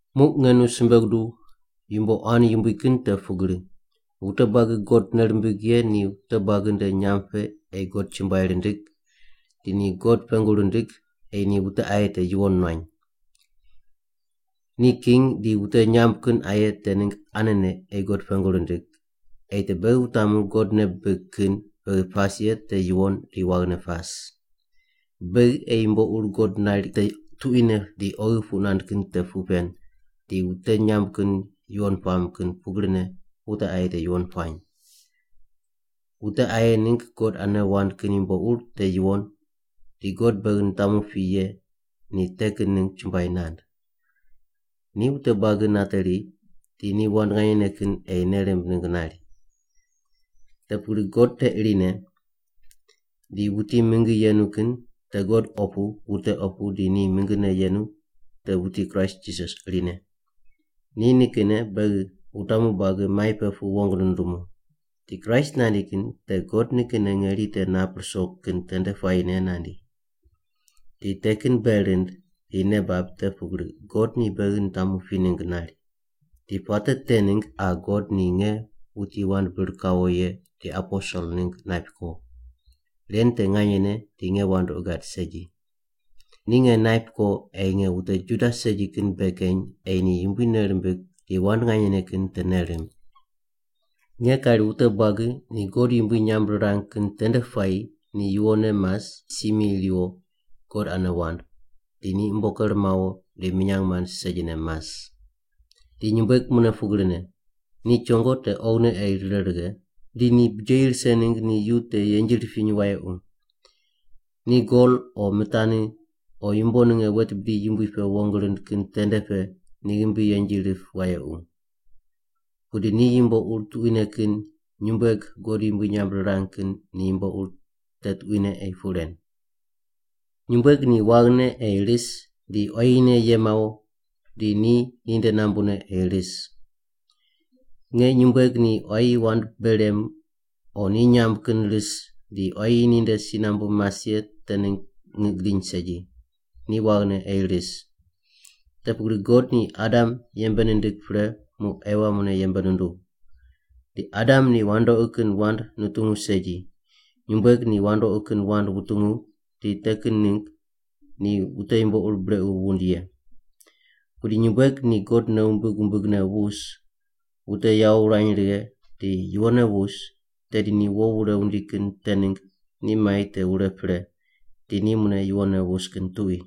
Muq nge nu simbe guduw yumbo quan yumbui kin te pugri, wute buagi God nei rimbig ye ni wute buagi nde nyamb pe ei God chumbuai rindig di ni God pengu rindig ei ni wute aye te yuwon nuany. Ni king di wute nyamb kin aye te ningg anene ei God pengu rindig ei te beghi wutamu God nei bibig kin beghi pas ye te yuwon di waghine pas. Beghi ei yumbo ur God nari te tuquine di oghi puq nand kin te puq pen di wute nyamb kin yuwon puam kin pugrine wute aye te yuwon puany. Wute aye ningg God ane wand kin yumbo ur te yuwon di God beghi nitamu pi ye ni te kin ningg chumbuai nand. Ni wute buagi nateri di ni wand nganyene kin ei nei rimb ningg nari. Te pugri, God te irine, di wuti mingi yenu kin te God opu wute opu di ni mingine yenu te wuti Kraist Jisas irine. Ni nikinne beghi wutamu buagi mai pe pu wong nundumu. Di Kraist nandi kin te God nikinne ngeri te nap ruso kin tende puayine nandi. Di te kin bei rind di nei bab te pugri God ni beghi nitamu pi ningg nari. Di puate te ningg qa God ni nge wuti wand bir kawo ye di aposel ningg naip ko. (Ren te nganyene di nge wandoqi gad segi.) Ni nge naip ko ei nge wute Juda segi kin bei keny ei ni Yumbui nei rimbig di wand nganyene kin te nei rimb. Nge kari wute buagi ni God yumbui nyamb rirang kin tende puayi ni yuwonne mas si mi riwo God ane wand, di ni umbo ker mawo di minyang mand segine mas. Di nyumbueg mune pugrine, ni chongo te oghine ei rire righe, di ni bijeyi rise ningg ni yu te yenji ripiny wayequ. Ni gol o mitani o yumbo ninge wet bidi yumbui pe wong rind kin tende pe ni ghimbi yenji rip wayequ. Pudi ni yumbo ur tuquine kin nyumbueg God yumbui nyamb rirang kin ni yumbo ur te tuquine ei puq ren. Nyumbueg ni waghine ei ris di quayine ye mawo di ni ninde nambune ei ris. Nge nyumbueg ni quayi wand bei rem o ni nyamb kin ris di quayi ninde si nambu mas ye te ningg ngiq gidiny segi, ni waghine ei ris. Te pugri God ni Adam yembe nindig pre muq Ewa mune yembe nunduw. Di Adam ni wandoqi kin wand nutungu segi, nyumbueg ni wandoqi kin wand wutungu di te kin ningg ni wute yumbo ur brequ wund ye. Pudi nyumbueg ni God nei wumbig wumbigne wus, wute yawo wurany righe di yuwonne wus, tedi ni wo wure wundi kin te ningg ni mai te wure pre, di ni mune yuwonne wus kin tuqui.